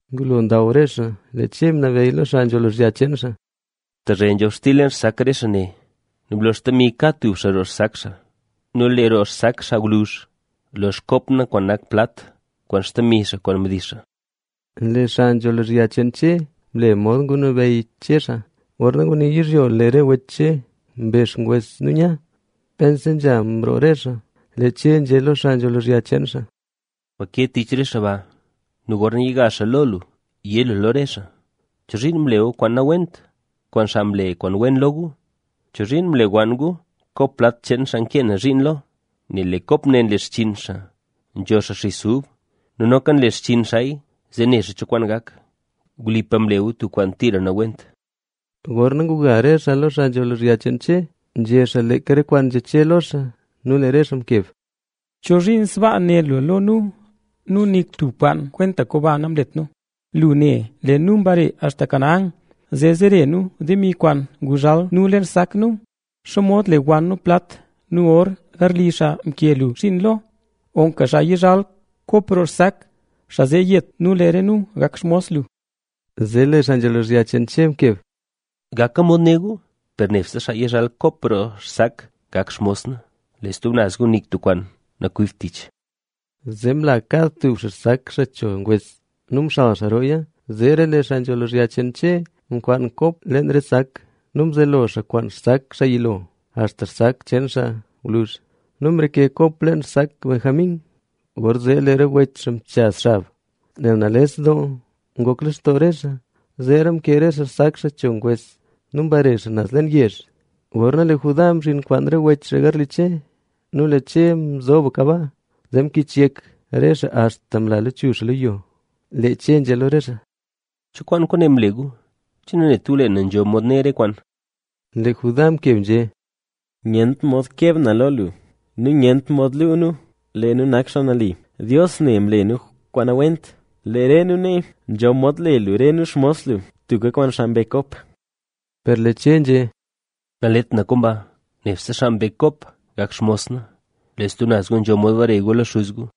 Ngulo ndaw re xaa, lee Che ngunabeyy lo xaa nzho lozhya cheen xaa: —Tezhe nzhobxtil leen xsak re xaa ne. Nu blo xtemi kad tub xaa roo xsak xaa. Nu lee roo xsak xaa gwluzh, lo xkop na kwaan nak plat kwaan xtemi xaa kwaan mdix xaa. Lee xaa nzho lozhya cheen Che mle mod ngunabeyy Che xaa. Gorna ngunil yizhyo, zee lee re wech Che mbe xngwes nu nya. Pense nzha mroo re xaa, lee Che nzhé lo xaa nzho lozhya cheen xaa: —Gwa ke tich re xaa ba nu gorna yiga xaa lo lu, yé lu lo re xaa: “¿Chozhiin mle gu kwaan nawent kwaan xaa mle kwaan wen lo gu? ¿Chozhiin mlewann gu kop plat cheen xaa nkee na zhiin lo? Nel lee kop ne nle xchinn xaa nzho xaa xis ub nu noka nle xchinn xaaya, zee ne xaa cho kwaan gak. Wlipa mle gu tub kwaan tira nawent.” Gorna nguga re xaa lo xaa nzho lozhya cheen Che, nzhé xaa leeka re kwaan nzhé Che lo xaa. Nu lee re xaa mkeb: —¿Chozhiin sbaa né lu lo nu? Nu nik tub komba nanlet nu. Lu ne lee nu mbare axta Canaán, zee zere nu demi kwaan nguzhal nu leen xsak nu. ¿Xomod lewann nu plat nu or garli xaa nke lu zhiin lo? Loka xaa yizhal kop roo xsak, xaa zee yet nu lee re nu gak xmos lu. Zee lee xaa nzho lozhya cheen Che mkeb: —Gaka mod né gu, per nebse xaa yizhal kop roo xsak gak xmos na. Lee stub naz gu nik tub kwaan nakwibt tich. Zee mla kad tub xaa xsak xaa cho ngwes nu mxal xaa rooya. Zeera lee xaa nzho lozhya cheen Che mkwaan kop leen re sak; nu mzelo xaa kwaan xsak xaa yilo axta sak cheen xaa gwluzh. ¡Nu mreke kop leen xsak Benjamín! Gorzee lee re wech xaa mchaz xab, nel nales doo ngok lextoo re xaa. Zeera mkee re xaa xsak xaa cho ngwes nu mbare xaa naz leen yezh. Gorna lee Judá mzhin kwaan re wech garli Che nu lee Che nzoka baa. Zee mkich yek re xaa axta mla lachuzh xaa lo yo. Lee Che nzhé lo re xaa: —¿Cho kwaan kwaane mle gu? ¿Che nanet gu lee na nzho mod ne re kwaan? Lee Judá mkeb nzhé: —Nyent mod keb na lo lu. Nu nyent mod luu nu lee nu nak xaa nali. Dios ne mle nu kwaan nawent. Lee re nu nee nzho mod le lu re nu xmos lu, tubka kwaan xaa mbe kop. Per lee Che nzhé: —Nalet na komba, nebse xaa mbe kop gak xmos na. Lee stub naz gu nzho mod bare gu lo xuz gu.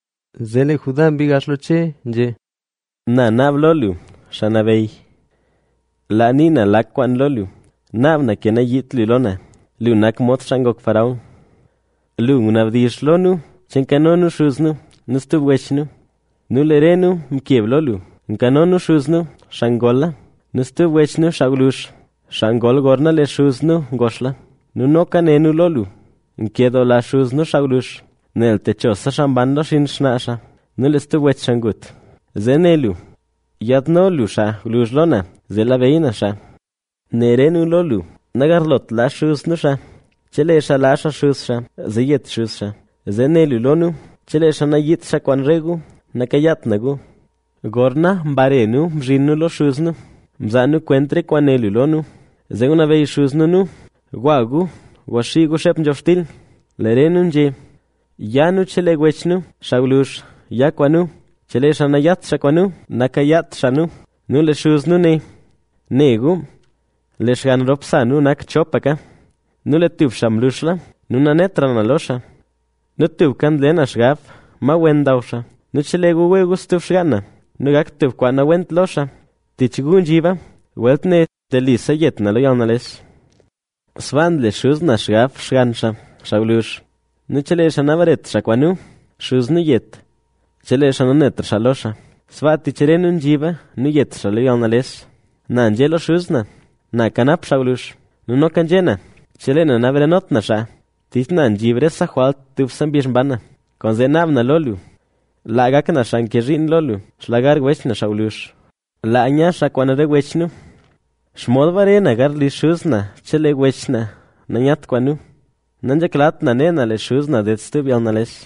Zee lee Judá mbii gax lo Che nu nzhé: —Na naab lo lu, xaa nabeyy, laa nii na lak kwaan lo lu. Naab na ke nayiit lu lo na. Lu nak mod xaa ngok faraón. Lu ngunabdizh lo nu che nkano nu xuz nu nu stub wech nu. Nu lee re nu mkeb lo lu: “Nkano nu xuz nu, xaa ngola nu stub wech nu xaa gwluzh, xaa ngol gorna lee xuz nu ngoxla”. Nu noka né nu lo lu: “Nkedoola xuz nu xaa gwluzh, nel techose xaa mban lo xinn xnaa xaa; nu lee stub wech xaa ngut”. Zee né lu: “Yaadno lu xaa gwluzh lo na, zee labeyy na xaa”. Né re nu lo lu: “Nagarlot laa xuz nu xaa. Chelee xaa laa xaa xuz xaa, zee yet xuz xaa.” Zee né lu lo nu: “Chelee xaa nayiidt xaa kwaan re gu, nakayaat na gu”. ’Gorna mbare nu mzhin nu lo xuz nu, mzaa nu kwent re kwaan né lu lo nu. Zee ngunabeyy xuz nu nu: “Gwa gu gwaxii gu xeep nzhobxtil”. Lee re nu nzhé: “Ya nu chelee wech nu xaa gwluzh ya kwaan nu. Chelee xaa nayat xaa kwaan nu, nakayaat xaa nu.” Nu lee xuz nu né: “Ne gu, lee xgann rop sa nu nak chopaka. Nu lee tub xaa mluxla nu nanetra na lo xaa. Nu tubka nle na xgab ma wen ndaw xaa. Nu chelee gu wee gu stub xgaan na nu gak tub kwaan nawent lo xaa, tich gu nzhiba. Welt ne telise yet na lo yalnales.” ’Sbaa nle xuz na xgab xgann xaa, xaa gwluzh. Nu chelee xaa nabaret xaa kwaan nu, xuz nu yet, chelee xaa nanetra xaa lo xaa. Sbaa tich re nu nzhiba nu yet xaa lo yalnales. Na nzhé lo xuz na: “Na kanap xaa gwluzh”. Nu noka nzhé na: “Chelee na nabarenot na xaa, tich na nzhib rese jwalt dubse mbizh mban na”. Kwaanzee naab na lo lu laa gak na xaa ke zhiin lo lu, xlugar wech na xaa gwluzh. Laa nya xaa kwaan re wech nu. ¿Xomod bare na garli xuz na chelee wech na nayat kwaan nu? Nanzheklat na ne na lee xuz na ded stub yalnales.